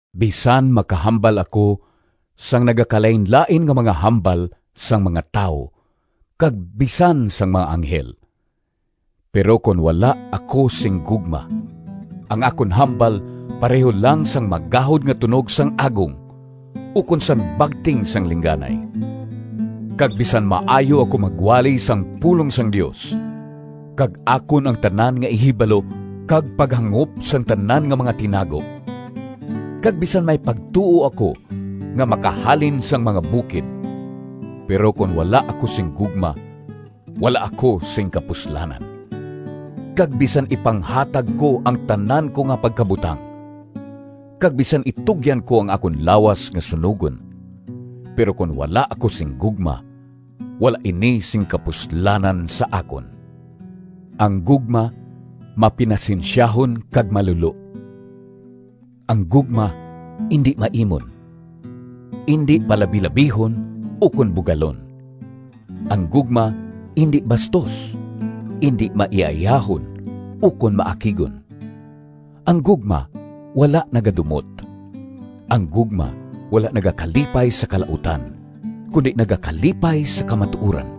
Bisan makahambal ako sang nagakalainlain nga mga hambal sang mga tawo kag bisan sang mga anghel, pero kon wala ako sing gugma, ang akon hambal pareho lang sang magahod nga tunog sang agong ukon sang bagting sang lingganay. Kag bisan maayo ako magwali sang pulong sang Dios, kag akon ang tanan nga ihibalo kag paghangop sang tanan nga mga tinago, kag bisan may pagtuo ako nga makahalin sang mga bukid, pero kon wala ako sing gugma, wala ako sing kapuslanan. Kag bisan ipanghatag ko ang tanan ko nga pagkabutang, kag bisan itugyan ko ang akon lawas nga sunogon, pero kon wala ako sing gugma, wala ini sing kapuslanan sa akon. Ang gugma mapinasensyahon kag malulo. Ang gugma indi maimon, indi palabilabihon ukon bugalon. Ang gugma indi bastos, indi maiyaiyahon ukon maakigon. Ang gugma wala nagadumot. Ang gugma wala nagakalipay sa kalautan, kundi nagakalipay sa kamatuoran.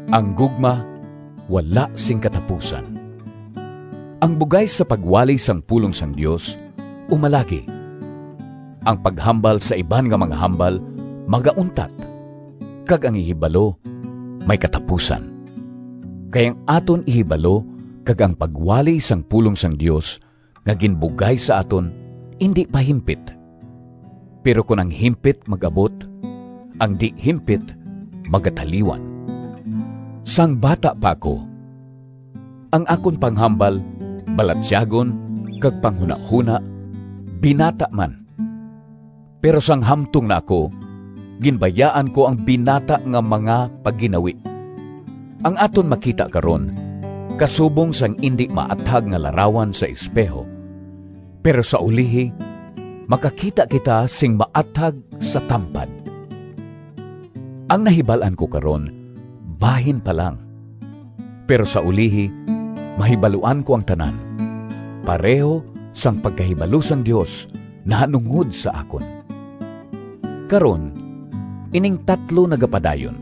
Ang gugma wala sing katapusan. Ang bugay sa pagwali sang pulong sang Dios umalagi, ang paghambal sa iban nga mga hambal magauntat, kag ang ihibalo may katapusan. Kay ang aton ihibalo kag ang pagwali sang pulong sang Dios nga ginbugay sa aton indi pa himpit. Pero kon ang himpit mag-abot, ang di-himpit magataliwan. Sang bata pa ako, ang akon panghambal, balatyagon, kag panghunahona binata man. Pero sang hamtong na ako ginbayaan ko ang binata nga mga pagginawi. Ang aton makita karon kasubong sang indi maathag nga larawan sa espeho, pero sa ulihi makakita kita sing maathag sa tampad. Ang nahibal-an ko karon bahin pa lang, pero sa ulihi mahibaluan ko ang tanan, pareho sang pagkahibalo sang Dios nahanungod sa akon. Karon, ining tatlo nagapadayon: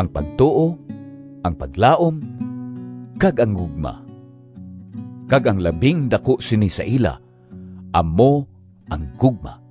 ang pagtuo, ang paglaom, kag ang gugma, kag ang labing daku sini sa ila amo ang gugma.